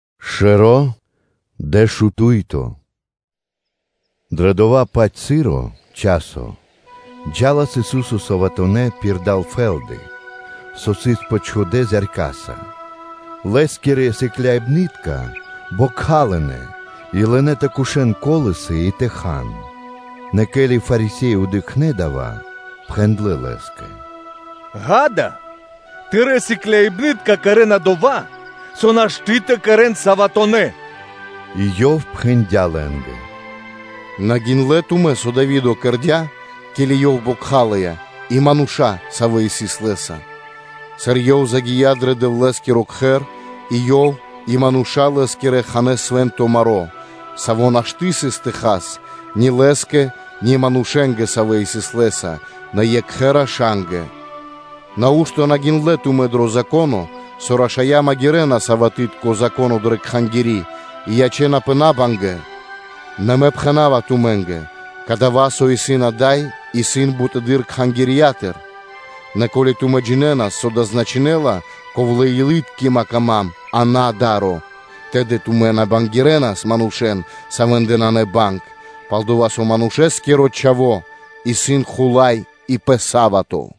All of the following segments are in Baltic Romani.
Пхучибэна́ пал Са́вато (Субо́та) Дро дова́-паць часо джа́лас Ису́со саватонэ́ (суботонэ́) пирда́л фэ́лды, со сыс почхудэ зяркаса; Лэ́скирэ сыкляибны́тка бокхалынэ и лынэ́ тэ кушэн колосы и тэ хан. Нэ ке́ли Фарисе́и дыкхнэ́ дава́, то пхэндлэ́ Лэ́скэ: “Дыкх, Тырэ́ сыкляибны́тка кэрэ́на дова́, со нашты́ тэ кэрэ́н саватонэ́ (суботонэ́).” И Ёв пхэндя́ лэ́нгэ: “На гиндлэ́ тумэ́, со Дави́до кэрдя́, ке́ли ёв бокхалыя и мануша́, савэ́ сыс лэ́са? Сыр ёв загия́ дро Дэвлэ́скиро Кхэр, и ёв и мануша́ лэ́скирэ ханэ́ свэнцындло маро́, саво́ нашты́ сыс тэ хан ни лэ́скэ, ни манушэ́нгэ, савэ́ сыс лэ́са, нэ екхэ рашангэ? Нау́што на гиндлэ́ тумэ́ дро Зако́но, со рашая́ магирэна саватытко (суботытко) Зако́но дрэ Кхангири́ и ячэ́напэ би бангипнаскиро? Нэ Мэ пхэна́ва тумэ́нгэ: кадава́, со исын ада́й, исын бутэды́р Кхангирья́тыр. Нэ ко́ли тумэ́ джинэнас, со дава́ значынэ́ла: ‘Ковлэ-илы́ткима трэй ма́нгэ, а на да́ро’, тэды тумэ́ на бангякирэнас манушэ́н, савэ́ндэ нанэ банг. Пал-дова́ со Манушэ́скиро Чхаво́ исын хула́й и пэ са́вато.”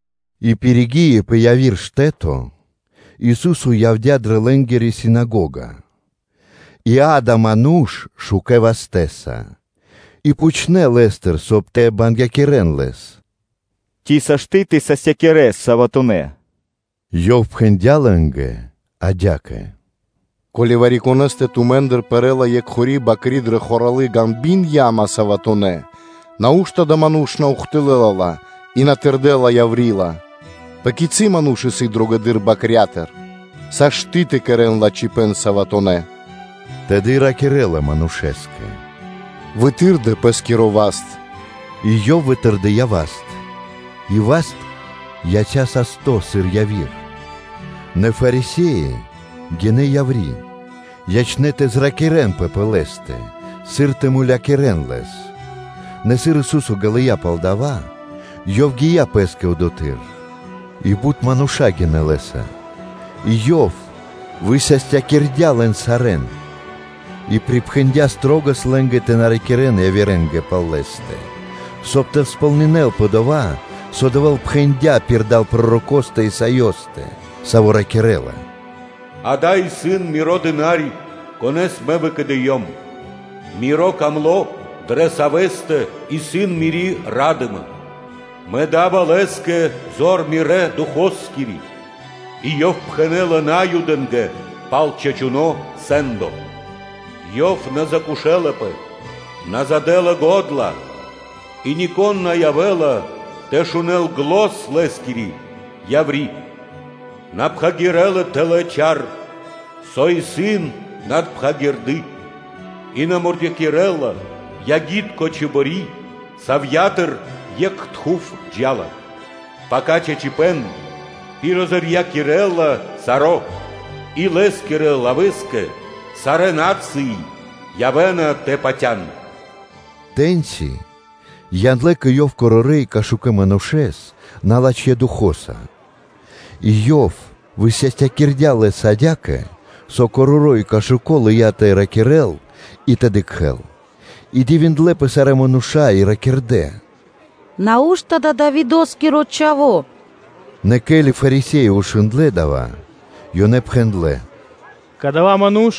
И пиригии пэ яви́р штэ́то, Ису́со явдя́ дрэ лэ́нгири синагога. И, акэ, сыс ману́ш шукэ́ вастэ́са. И пхучнэ́ Лэ́стыр, соб (кай) тэ бангякирэн Лэс: “Ци сашты́ (можна) тэ састякирэс саватонэ́ (суботонэ́)?” Ёв пхэндя́ лэ́нгэ адя́кэ: “Ко́ли вари-конэ́стэ тумэ́ндыр пэрэ́ла екхори бакри дрэ хоралы ґанби́н (яма) саватонэ́ (суботонэ́), нау́што адава́ ману́ш на ухтылэ́ла ла и на тырдэла яври́ ла? Пэ кицы́ ману́ш исын дрогэдыр бакрятыр? Сашты́ тэ кэрэ́н лачхипэ́н саватонэ́ (суботонэ́)!” Тэды ракирэ́ла манушэ́скэ: “Вытырдэ пэ́скиро васт!” И ёв вытырдыя васт, и васт яця́ састо́, сыр яви́р. Нэ Фарисе́и гинэ́ яври́, ячнэ́ тэ зракирэнпэ пэ Лэ́стэ, сыр тэ мулякирэ́н Лэс. Нэ сыр Ису́со ґалыя́ пал дова́, Ёв гия́ пэ́скэ одотхы́р. И бут мануша́ гинэ́ Лэ́са, и Ёв высастякирдя́ лэн сарэ́н, и припхэндя́ шылалэс лэ́нгэ тэ на ракирэ́н явирэ́нгэ пал Лэ́стэ; соб (кай) тэ сполнинэ́лпэ дова́, со Дэвэ́л пхэндя́ пирда́л пророкостэ Исаёстэ, саво́ ракирэ́ла: “Акэ, исын, Миро дына́ри, Конэ́с Мэ выкэдыём, Миро Дро́го, дрэ Савэ́стэ исын Мири́ ра́дыма; Мэ да́ва Лэ́скэ зор Мирэ́ Духоскири (Фаноскири), и Ёв пхэнэ́ла Наюдэ́нгэ пал чачуно́ сэ́ндо. Ёв на закошэлапэ, на задэла го́дла, и нико́н на явэ́ла тэ шунэ́л зан (глос) Лэ́скири яври́; На пхагирэ́ла тэлэ́ чар, со исын надпхагирды, и на мурдякирэла ягитко чибори, савья́тыр екх тхув (дымо) джа́ла, пака чачипэ́н пиризорьякирэла саро́. И Лэ́скирэ лавэ́скэ сарэ́ на́цыи явэ́на тэ патя́н.” Тэ́ньци яндлэ́ кэ Ёв корорэ́ и кашукэ манушэ́с налачхэ́ духо́са и Ёв высастякирдя́ лэс адя́кэ, со короро́ и кашуко лыя́ тэ ракирэ́л и тэ дыкхэ́л. И дивиндлэ́пэ сарэ́ мануша́ и ракирдэ́: “Нау́што дава́ исын Давидо́скиро Чхаво́?” Нэ ке́ли Фарисе́и шундлэ́ дава́, ёнэ пхэндлэ́: “Кадава́ ману́ш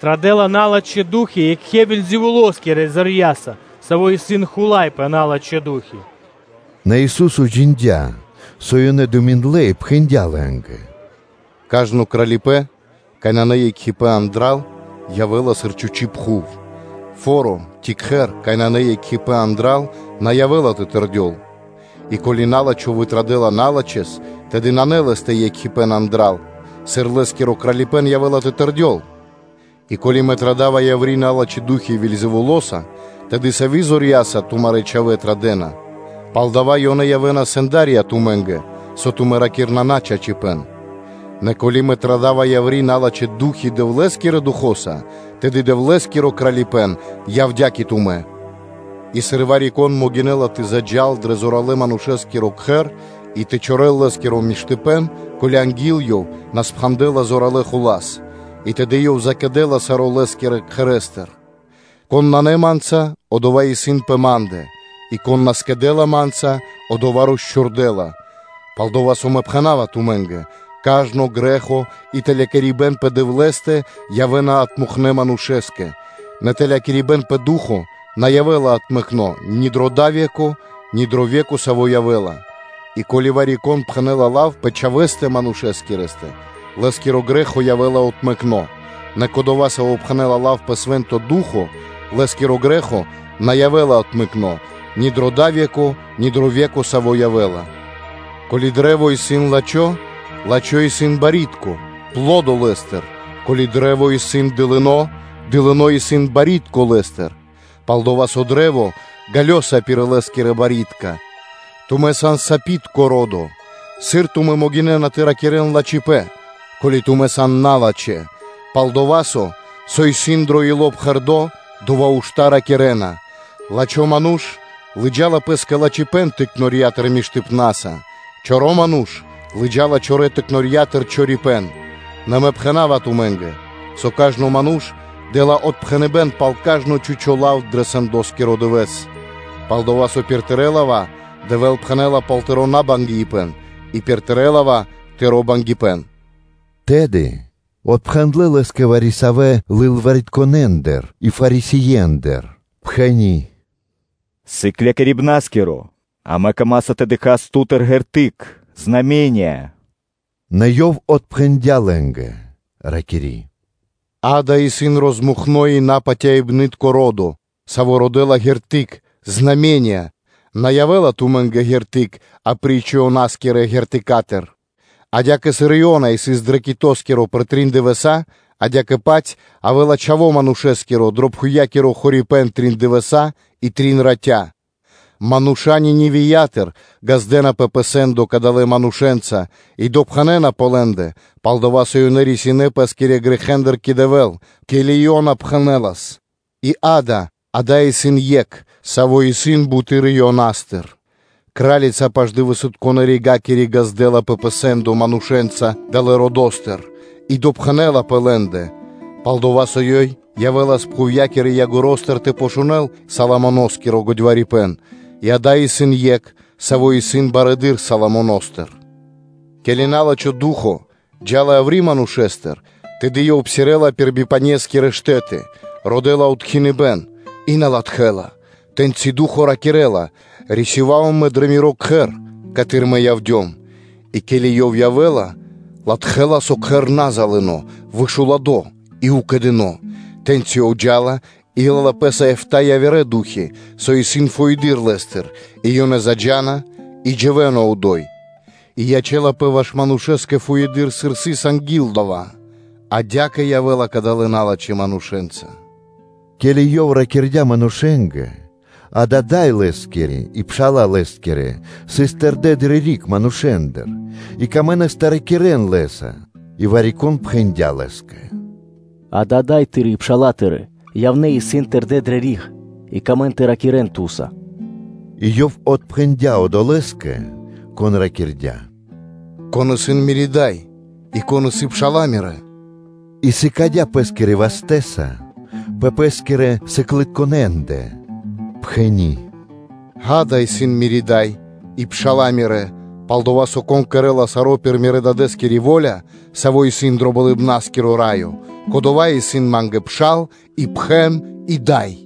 традэ́ла налачхэ́ ду́хи екхэ Вельзэвулоскирэ зорья́са, саво́ исын хула́й пэ налачхэ́ ду́хи.” Нэ Ису́со джиндя́, со ёнэ думиндлэ и пхэндя́ лэ́нгэ: “Кажно кралипэ́н, кай нанэ екхипэ́н андра́л, явэ́ла сыр чхучи́ пхув, и кажно фо́ро ци кхэр, кай нанэ екхипэ́н андра́л, на явэ́ла тэ тэрдёл. И ко́ли на́лачхо вытрадэла налачхэ́с, тэды нанэ лэ́стэ екхипэ́н андра́л, сыр лэ́скиро кралипэ́н явэ́ла тэ тэрдёл? И ко́ли Мэ традава яври́ налачхэ́ ду́хи Вельзэвулоса, тэды савэ́ зорья́са тумарэ́ чхавэ́ традэ́на? Палдава́ ёнэ явэ́на сэнда́рья тумэ́нгэ, со тумэ́ ракирэ́на начачипэ́н. Нэ ко́ли Мэ традава яври́ налачхэ́ ду́хи Дэвлэ́скирэ Духо́са (Фаноса), тэды Дэвлэ́скиро Кралипэ́н явдя́ кэ тумэ́. И сыр вари-кон могинэ́ла тэ заджа́л дрэ зоралэ́-манушэ́скиро кхэр и тэ чорэл лэ́скиро миштыпэ́н, ко́ли анги́л ёв на спхандэла зоралэ́ хула́с. И тэды ёв залэла саро́ лэ́скирэ кхэрэ́стыр. Кон исын на Ма́нца, одова́ исын пэ Ма́ндэ, и кон на скэдэ́ла Ма́нца, одова́ росчхурдэла. Палдова́ Мэ пхэна́ва тумэ́нгэ: кажно грэ́хо и тэлякирибэн пэ Дэвлэ́стэ явэ́на отмэкнэ манушэ́скэ, нэ калякирибэн пэ Ду́хо (Фа́но) на явэ́ла отмэкно ни дро дава́ ве́ко, ни дро ве́ко, саво́ явэ́ла. И ко́ли вари-кон пхэнэ́ла лав пэ Чхавэ́стэ Манушэскирэстэ, лэ́скэ грэ́хо явэ́ла отмэкно, нэ кодова́, саво́ пхэнэ́ла лав пэ Свэ́нто Ду́хо (Фа́но), лэ́скиро грэ́хо на явэ́ла отмэкно ни дро дава́ ве́ко, ни дро ве́ко, саво́ явэ́ла. Ко́ли кашт (дрэ́во) исын лачхо́, лачхо́ исын барьякирдо́ (пло́до) лэ́стыр; ко́ли кашт исын дылыно́, дылыно́ исын барьякирдо́ лэ́стыр, пал-дова́ со кашт ґалёса пир лэ́скирэ барьякирдэ́. Тумэ́ сан сапитко ро́до! Сыр тумэ́ могинэ́на тэ ракирэ́н лачхипэ́н, ко́ли тумэ́ сан налачхэ́? Пал-дова́ со, со исын дро ило́ пхэрдо́, дова́ ушта́ ракирэ́на. Лачхо́ ману́ш лыджа́ла пэ́скэ лачхипэ́н лачхэ́ пиралятыр; чоро ману́ш лыджа́ла чорэ́ пиралятыр чорипэ́н. Нэ Мэ пхэна́ва тумэ́нгэ, со кажно ману́ш дэ́ла отпхэныбэ́н пал кажно чхучо́ лав дро сэндоскиро дывэ́с: пал-дова́ со пир тырэ́ лава́ Дэвэ́л пхэнэ́ла пал тыро́ набангипэн и пир тырэ́ лава́ тыро́ бангипэн.” Тэды отпхэндлэ́ Лэ́скэ вари-савэ́ лылваритконэндыр и Фарисеендыр, пхэни́: “Сыклякирибна́скиро, амэ камаса тэ дыкхас Ту́тыр ґерты́к (знаме́ниё).” Нэ Ёв отпхэндя́ лэ́нгэ, ракири́: “Акэ, исын пэсьцёно и напатяибнытко ро́до, саво́ родэ́ла ґерты́к; на явэ́ла тумэ́нгэ ґерты́к апри́ч Ионаскирэ ґертыкатыр. Адя́кэ, сыр Иона сыс дро китоскиро пэр трин дывэса́, адя́кэ-паць явэ́ла Чхаво́ Манушэ́скиро дро пхувья́киро хорипэ́н трин дывэса́ и трин ратя. Мануша́ Ниневиятыр ґаздэ́напэ пэ сэ́ндо кадалэ́ манушэ́нца и допхэнэна пэ лэ́ндэ, пал-дова́ со ёнэ рисинэ́ пэ́скирэ грэхэ́ндыр кэ Дэвэ́л, ке́ли о Иона пхэнэлас, и, акэ, ада́й исын Екх, Саво́ исын буты́р Ионастыр. Кра́лица Паш-Дывэсытконэ (Югоскирэ) Ригакири ґаздэ́лапэ пэ сэ́ндо манушэ́нца далэ́ родо́стыр и допхэнэ́ла пэ лэ́ндэ: пал-дова́ со ёй явэ́лас пхувья́кирэ ягоро́стыр (краёстыр) тэ шунэ́л Соломоно́скиро годьварипэн, и, ада́й исын Екх, Саво́ исын барэды́р Соломоностыр. Ке́ли на́лачхо ду́хо (фа́но) джа́ла яври́ манушэ́стыр, тэды ёв псирэ́ла пир бипанескирэ штэ́ты, родэ́ла штэ́то тэ откхинёл и на латхэ́ла. Тэ́ньци ду́хо ракирэ́ла: ‘Рисёва́ва мэ дро миро кхэр, каты́р мэ явдём’; и ке́ли ёв явэ́ла, латхэ́ла, со кхэр исын на залыно, вышуладо и укэдыно. То тэ́ньчи ёв джа́ла и лэ́ла пэ́са эфта́ яви́р ду́хи, со исын фуеды́р лэ́стыр, и ёнэ заджа́на и дживэ́на одо́й, и ячэ́лапэ ваш адалэ́ манушэ́скэ фуеды́р, сыр сыс анги́л дава́. Адя́кэ явэ́ла кадалэ́ налачхэ́ манушэ́нца.” Ке́ли Ёв ракирдя́ манушэ́нгэ, акэ, дай Лэ́скири и пша́ла Лэ́скирэ сыс тэрдэ́ дрэ риг манушэ́ндыр, и лэ́нгэ трэиндя́ тэ ракирэ́н Лэ́са. И вари-кон пхэндя́ Лэ́скэ: “Акэ, Дай Тыри́ и пша́ла Тырэ́ явнэ́ и исын тэрдэ́ дрэ риг, и лэ́нгэ трэй Ту́са.” И Ёв отпхэндя́ одолэ́скэ, кон ракирдя́: “Кон исын Мири́ Дай, и кон исын пша́ла Мирэ́?” И сыкадя́ Пэ́скирэ вастэ́са пэ Пэ́скирэ сыклытконэндэ, пхэни́: “Акэ, исын дай Мири́ и пша́ла Мирэ́. Пал-дова́ со, кон кэрэ́ла саро́ пир Мирэ́ Дадэ́скири во́ля, Саво́ исын дро Болыбна́скиро Раё, кодова́ исын Ма́нгэ пшал и пхэн и дай.”